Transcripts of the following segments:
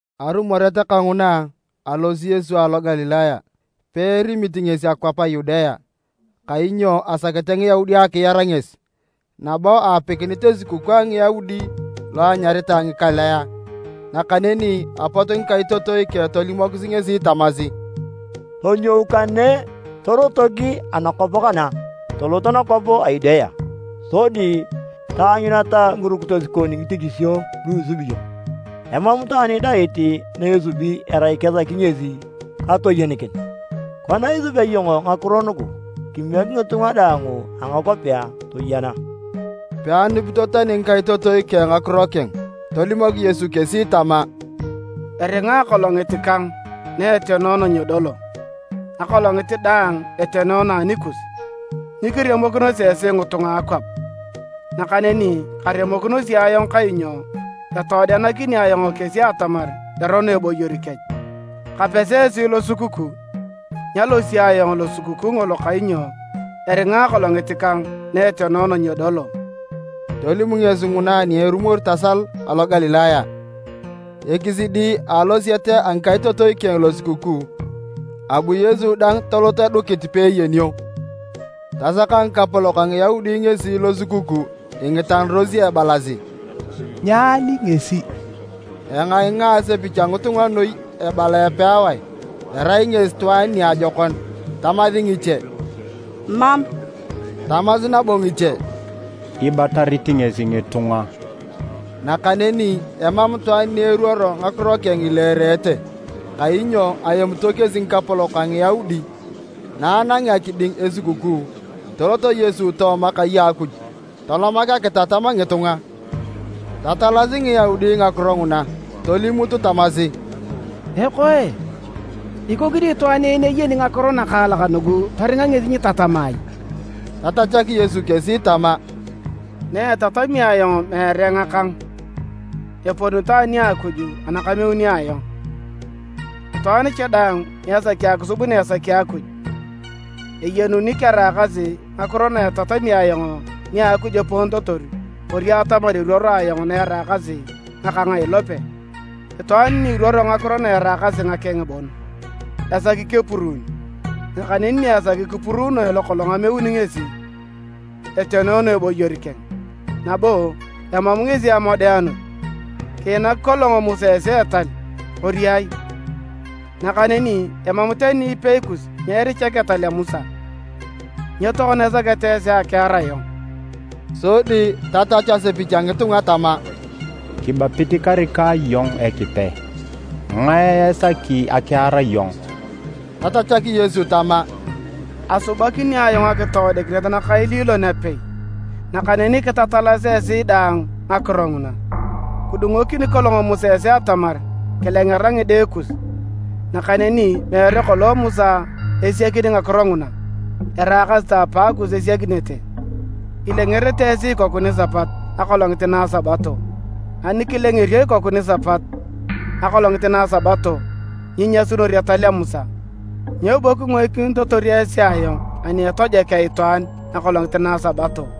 Arumoret kanguna, alosi Yesu alo Galilaya. Peerimit ngesi akwap a Yudea, kainyo asakete Ngiyaudi akiar ngesi. Nabo aapikinit Esukukuu a Ngiyaudi lo anyaritae Ngikalea, nakaneni apot ngikaitotoi keng tolimokis ngesi tamasi, “Tonyou kane torotok anakwap kana, tolot nakwap a Yudea, sodi taanyuneta ngirukitos kon ngitichisio lu isubi iyong. Emam itwaan idait na esubi erai kesaki ngesi katoyenikin. Kona isubea iyong ngakiro nugu, kimiek ngitunga daang a ngakwapea toyena!” ( Peanupito tani ngikaitotoi keng ngakiro keng.) Tolimok Yesu kesi tama, “Eringa akolongit kang na etenoono nyedolo. Akolongit daang etenoono anikus. Nyikiremokinosi esi ngitunga a akwap, nakaneni karemokinosi ayong kainyo etoodenakini ayong kesi atamar erono eboyor kech. Kapesi esi losukukuu, nyalosi ayong losukukuu ngolo kainyo eringa akolongit kang na etenoono nyedolo.” Tolim ngesi nguna ani erumor tasal alo Galilaya. Ekisidi a alosiet a ngikaitotoi keng losukukuu, abu Yesu dang tolot edukit peeyenio. Tasaka ngikapolok a Ngiyaudi ngesi losukukuu, ingitanarosi ebalasi, “Nyaali ngesi?” Engainga asepich a ngitunga noi ebala epewae, “Erai ngesi itwaan niajokon,” tamasi ngiche, “Mam”, tamasi nabo ngiche, “Ibatarit ngesi ngitunga.” Nakaneni emam itwaan ni eruoro ngakiro keng ileerete, kainyo aemito kesi ngikapolok a Ngiyaudi. Na anangea kiding Esukukuu, tolot Yesu tooma kai a Akuj, tolomak akitatam ngitunga. Tatalasi Ngiyaudi ngakiro nguna tolimut tamasi, “Ekoe! Ikoni itwaan en eyeni ngakiro nakaalak nugu toringa ngesi nyitatama ai?” Tatachak Yesu kesi tama, “Naetatami ayong meere ngakang, eponito ani a Akuj ana kameuni ayong. Itwaan cha daang ni esaki akisub na esaki Akuj, eyenuni keraakasi ngakiro na etatami ayong nia Akuj eponitotor kori atamar eruoro ayong na eraakasi ngakang a ilope. Itwaan ni iruoro ngakiro na eraakasi ngakeng bon, esaki kepuruun. Nakaneni ni esaki kipuruunoe lokolong ameuni ngesi, etenoono eboyor keng, nabo emam ngesi amodeanut. Kiinak kolong Musa esi etal, kori ai? Nakaneni emam tani ipei kus ni erichak etal a Musa. Nyo tokona isaketa esi akiar ayong?” Sodi tatachu asepich a ngitunga tama, “Kibapit karika iyong Ekipe. Ngae esaki akiar iyong?” Tatachak Yesu tama, “Asubakini ayong akitoodikinet nakaililon apei, nakaneni kitatalasi esi daang ngakiro nguna. Kidungokini kolong Musa esi atamar kilengera ngide kus: (nakaneni meere kolong Musa esiakini ngakiro nguna, araakasi ta apaakus esiakinete), ilengerenete esi ikoku nisapat akolongit na a Sabato. Ani kilengerio ikoku nisapat akolongit na a Sabato nyinyasunor etal a Musa, nyo bo kingoikinitotor esi ayong ani etojokea itwaan akolongit na Sabato?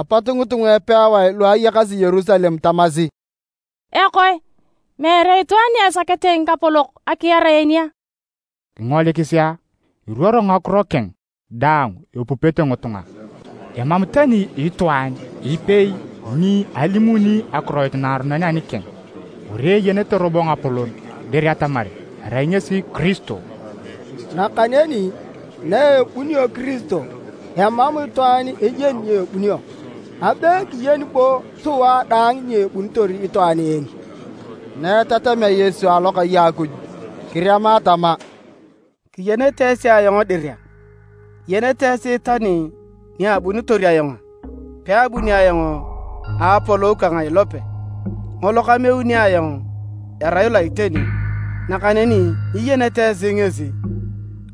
Apot ngitunga epewae luayakasi Yerusalem tamasi, “Ekoe! Meere itwaan ni esakete ngikapolok akiar en a? Kingolikisi a! Iruoro ngakiro keng daang epupete ngitunga, emam tani itwaan ipei ni alimuni akiroit naaronon anikeng! Kori eyenete robo ngapolon dir atamar erai ngesi Kiristo? Nakaneni na ebunio Kiristo, emam itwaan eyeni ni ebunio. Abe kiyeni bo sua daang ni ebunitor itwaan en.” Na etatamea Yesu alokai a Akuj, kirema tama, “Kiyenete esi ayong dir a? Iyenete esi tani ni abunitor ayong a? Peabuni ayong a apolou kang a ilope. Ngolo kameuni ayong erai lo a iteni, nakaneni nyiyenete esi ngesi.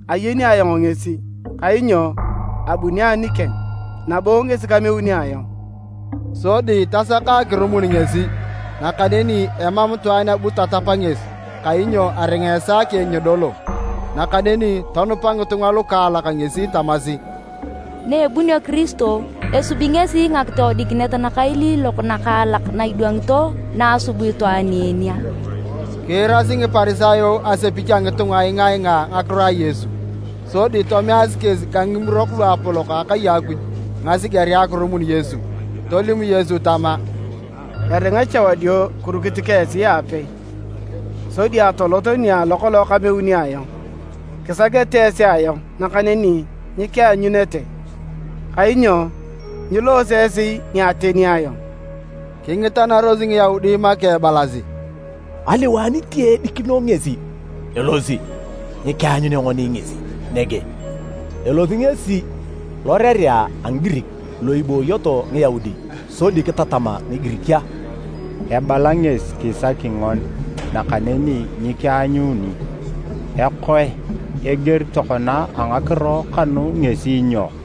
Ayeni ayong ngesi, kainyo abuni anikeng, nabo ngesi kameuni ayong.” Sodi tasaka akirumun ngesi, nakaneni emam itwaan abu tatap ngesi kainyo aringa esaa keng nyedolo. Nakaneni tonupa ngitunga lukaalak ngesi tamasi, “Naebunio Kiristo, esubi ngesi ngakitoodikinet nakailiilok nakaalak na idwangito na asub itwaan en a?” Kiirasi Ngiparisayo asepich a ngitunga ingaingaa ngakiro a Yesu, sodi tomeasi kesi ka Ngimurok Luapolok a akai a Akuj ngasigerea akirumun Yesu. Tolim Yesu tama, “Eringa cha wadio kirukit ka esi aapei, sodi atolot nia alo kolong kameuni ayong. Kisakete esi ayong nakaneni nyikianyunete kainyo nyiloose esi ni ateni ayong.” Kingitanaros Ngiyaudi make ebalasi, “Aliwae niti edikino ngesi elosi ni nyikianyunea ngoni ngesi nege? Elosi ngesi lorerea a Ngigirik lu ibooyoto Ngiyaudi, sodi kitatam Ngigirik a? Ebala ngesi kisaki ngoni nakaneni nyikianyuni. Ekoe, eger tokona a ngakiro kanu ngesi nyo?”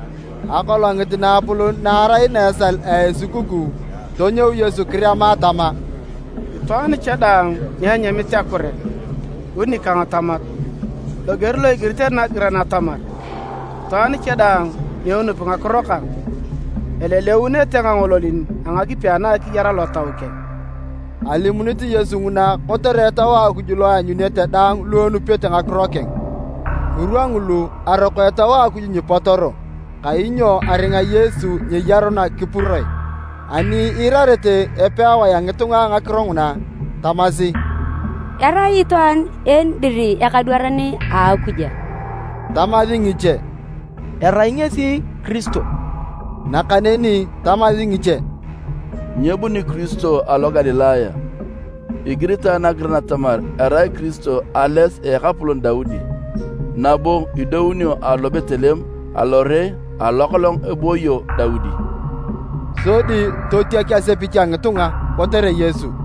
Akolongit naapolon na arai na esal a Esukukuu, tonyou Yesu kirema tama, “Itwaan cha daang ni enyamit akure, bu nikang tamat. Loger lo igiritere nagiran atamar, ‘Itwaan cha daang ni enupi ngakiro kang, eleleunete ngangololin a ngakipi ana akiyar alotau keng.’” Alimunit Yesu nguna kotere Etau a Akuj lo eanyunete daang lu enupete ngakiro keng. Ngirwa ngulu, aroko Etau a Akuj nyipotoro, kainyo aringa Yesu nyeyaruna kipuroe. Ani iirarete epewae a ngitunga ngakiro nguna, tamasi, “Erai itwaan en dir ekadwaran a Akuj!” Tamasi ngiche, “Erai ngesi Kiristo!” Nakaneni tamasi ngiche, “Nyebuni Kiristo alo Galilaya. Igiritae nagiran atamar erai Kiristo ales a ekapolon Daudi, nabo idounio alo Betleem alore alo kolong ebooyo Daudi.” Sodi totiak asepich a ngitunga kotere Yesu.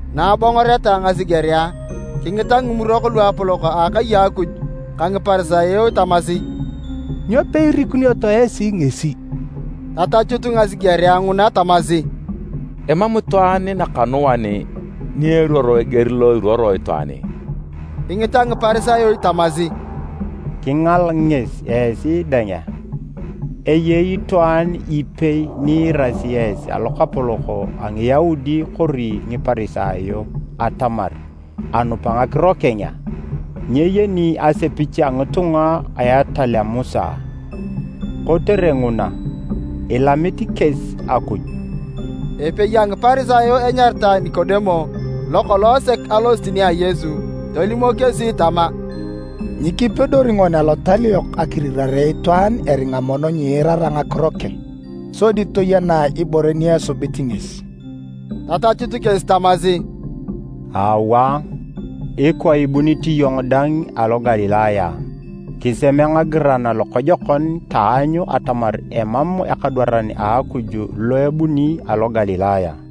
Na abongoreta ngasigerea, kingita Ngimurok Luapolok a Akai a Akuj ka Ngiparisayo tamasi, “Nyo peirikunioto esi ngesi?” Tatachut ngasigerea nguna tamasi, “Emam itwaan nakanuan ni eruoro eger lo iruoror itwaan en!” Kingita Ngiparisayo tamasi, “Kingal ngesi esi dang a? Eyei itwaan tani ipei ni iirasi esi alokapolok a Ngiyaudi kori Ngiparisayo atamar anup ngakiro keng a? Nyeyeni asepich a ngitunga na etal a Musa, kotere nguna, ilamit kesi Akuj!” Epei a Ngiparisayo enyaritae Nikodemo, lokolong sek alosit nia Yesu, tolimok kesi tama, “Nyikipedori ngoni Alotal yok akirirare itwaan eringa mono nyiirara ngakiro keng, sodi toyenae ibore ni esubit ngesi.” Tatachut kesi tamasi, “Aawa, ikwa ibunit iyong dang alo Galilaya a? Kiseme ngagiran lokojokon taanyu atamar emam ekadwaran a Akuj lo ebuni alo Galilaya.”